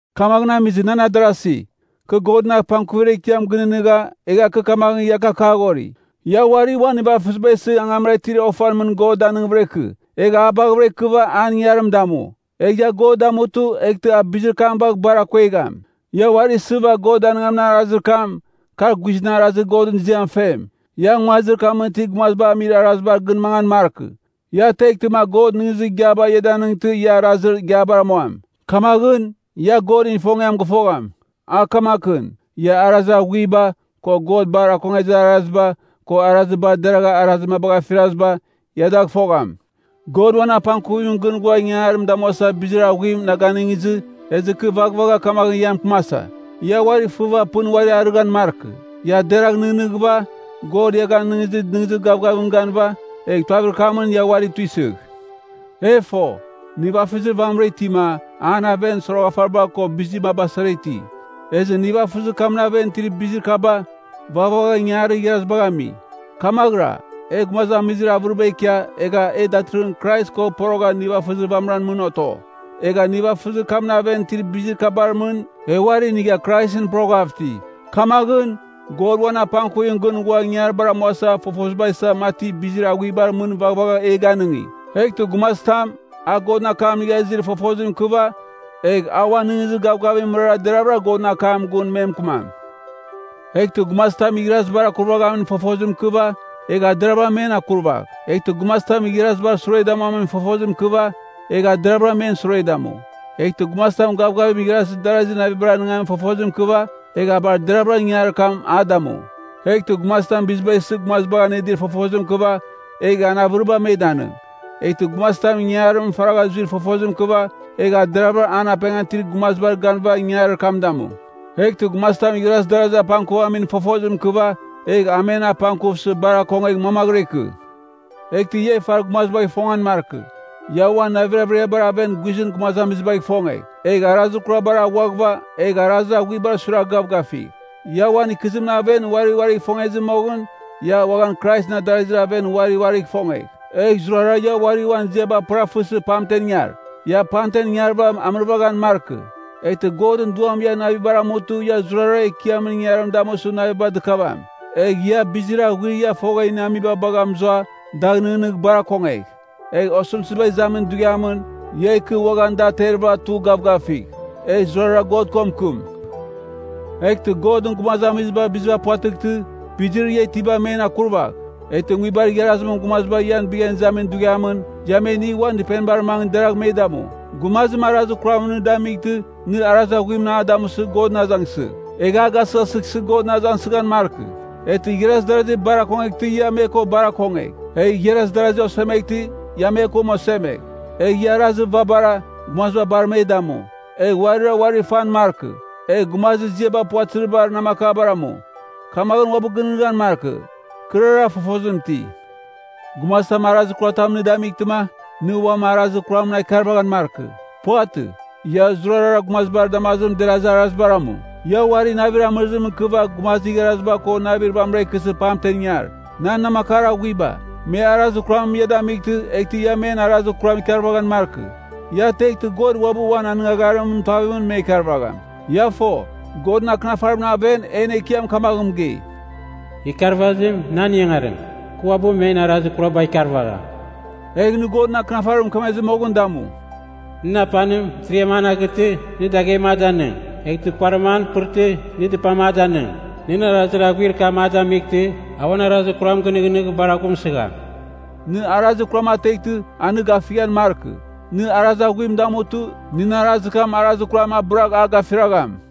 Kamaghɨn amizɨ, nan adarasi, kɨ Godɨn apangkuvir ekiam gɨnɨghnɨgha, egha kɨ kamaghɨn ia gakaghori: Ia uari uan nivafɨziba isɨ angamra itir ofan mɨn God danɨngvɨra ikɨ. Egh a baghɨvɨra ikɨva an ingangarim damu. Egh ia God damutɨ, eghtɨ a bizir kam bagh bar akuegham. Ia uari isɨva God danɨngamin arazir kam, kar guizɨn arazir Godɨn ziam fem. Ia nguazir kamɨn itir gumaziba amir arazibar gɨn mangan markɨ. Ia teghtɨma God nɨghnɨzir igiaba ia danɨngtɨ ia arazir igiabar amuam. Kamaghɨn, ia Godɨn ifongiam gɨfogham, a kamakɨn: ia arazir aghuiba, ko God bar akongezir araziba, ko arazir bar deragha arazir mabagh afiraziba, ia dagh fogham. God uan apangkuvimɨn gɨn ghua ingangarim damuasa bizir aghuim na ganɨngizɨ, ezɨ kɨ vaghvagha kamaghɨn ia mɨkɨmasa. Ia uari fɨva pɨn uari arɨghɨn markɨ. Ia deragh nɨghnɨghɨva, God ia ganɨngizir nɨghnɨzir gavgavimɨn ganɨva, egh tuavir kamɨn ia uari tuisɨgh. E fo, nivafɨzir vamɨra itima, an aven soroghafariba ko bizir maba sara iti. Ezɨ nivafɨzir kamɨn aven itir bizir kaba, vaghvagha ingangarir igharazibagh ami. Kamaghɨra, e gumazamizir avɨriba ikia, egha e datɨrɨghɨn Krais ko porogha nivafɨzir vamɨran mɨn oto. Egha nivafɨzir kamɨn aven itir bizir kabar mɨn, e uari inigha Kraisɨn poroghav iti. Kamaghɨn, God uan apangkuvimɨn gɨn ghua ingangaribar amuasa fofoziba isa mati bizir aghuibar mɨn vaghvagha e ganɨngi. Eghtɨ gumazitam, a Godɨn akam inigha izir fofozim ikɨva, egh a uan nɨghnɨzir gavgavimɨn mɨrara deravɨra Godɨn akam gun me mɨkɨmam. Eghtɨ gumazitam igharazibar akurvaghamin fofozim ikɨva, egh a deravɨra men akurvagh. Eghtɨ gumazitam igharazibar sure damuamin fofozim ikɨva, egh a deravɨra men sure damu. Eghtɨ gumazitam gavgavim igharaz darazir navibar anɨngamin fofozim ikɨva, egh a bar deravɨra ingangarir kam a damu. Eghtɨ gumazitam biziba isɨ gumazibagh anɨdir fofozim ikɨva, egh an avɨriba me danɨng. Eghtɨ gumazitam ingangarimɨn faragha zuir fofozim ikɨva, egh a deravɨra an apengan itir gumazibar ganɨva ingangarir kam damu. Eghtɨ gumazitam igharaz darazir apangkuvamin fofozim ikɨva, egh a men apangkuvsɨ bar akongegh mamaghɨra ikɨ. Eghtɨ ia ifar gumazibagh ifongan markɨ, ia uan navir averiabar aven guizɨn gumazamizibagh ifongegh. Egh arazir kurabar aghuaghɨva, egh arazir aghuibar suiragh gavgafigh. Ia uan ikɨzimɨn aven uari uarigh ifongezɨ moghɨn, ia uaghan Kraisɨn adarazir aven uari uarigh ifongegh. Egh zurara ia uarira uan ziaba pɨrafɨsɨ pamtem ingar. Ia pamten ingarɨva amɨrvaghan markɨ, eghtɨ Godɨn Duam ian navibar amutɨ ia zurara Ekiamɨn ingangarim damusɨ naviba dɨkavam. Egh ia, bizir aghuir ia fogha iniamiba bagha mɨzua, dagh nɨghnɨgh bar akongegh. Egh osɨmtɨziba izamin dughiamɨn, ia ikɨ uaghan da aterɨva tugh gavgafigh. Egh zurara God ko mɨkɨm. Eghtɨ Godɨn gumazamiziba biziba puvatɨghtɨ, bizir ia itiba men akurvagh. Eghtɨ nguibar igharazimɨn gumaziba ian bighan izamin dughiamɨn, ia me inigh uan dɨpenibar mangɨ deragh me damu. Gumazim arazir kuramɨn nɨ damightɨ, nɨ arazir aghuimɨn a damusɨ Godɨn azangsɨgh. Egh a gasɨghasɨghsɨ Godɨn azangsɨghan markɨ. Eghtɨ igharaz darazi bar akongeghtɨ ia me ko bar akongegh. Egh igharaz darazi osemeghtɨ, ia me ko osemegh. Egh ia arazir vabara, gumaziba bar me damu. Egh uarira uari fan markɨ. Egh gumazir ziaba puvatɨzibar namakabar amu. Kamaghɨn uabɨ gɨnɨghnɨghan markɨ, kɨrara fofozim iti. Gumazitam arazir kuratamɨn nɨ damightɨma, nɨ uam arazir kuramɨn a ikarvaghan markɨ. Puvatɨ. Ia zurara gumazibar damazimɨn derazir arazibar amu. Ia uari navir amɨrizim ikɨva gumazir igharaziba ko navir vamɨra ikɨsɨ pamtem ingar. Nan namakar aghuiba, me arazir kuram ia damightɨ, eghtɨ ia men arazir kuram ikarvaghan markɨ. Ia teghtɨ, God uabɨ uan anɨngagharimɨn tuavimɨn me ikarvagham. Ia fo, Godɨn Akɨnafarimɨn aven en Ekiam kamaghɨn mɨgei, “Ikiarvazim nan ingangarim, kɨ uabɨ men arazir kuraba ikarvagham.” Egh nɨ Godɨn Akɨnafarim mɨkemezɨ moghɨn damu, “Nɨn apanim, mɨtiriam an aghɨtɨ, nɨ daghem a danɨng. Eghtɨ kuarim an pɨrtɨ, nɨ dɨpatam a danɨng. Nɨn arazir aghuir kam a damightɨ, a uan arazir kuram gɨnɨghnɨgh bar aghumsɨgham.” Nɨ arazir kuram ateghtɨ, a nɨ gafighan markɨ. Nɨ arazir aghuim damutɨ, nɨn arazir kam arazir kuram abɨragh a gafiragham.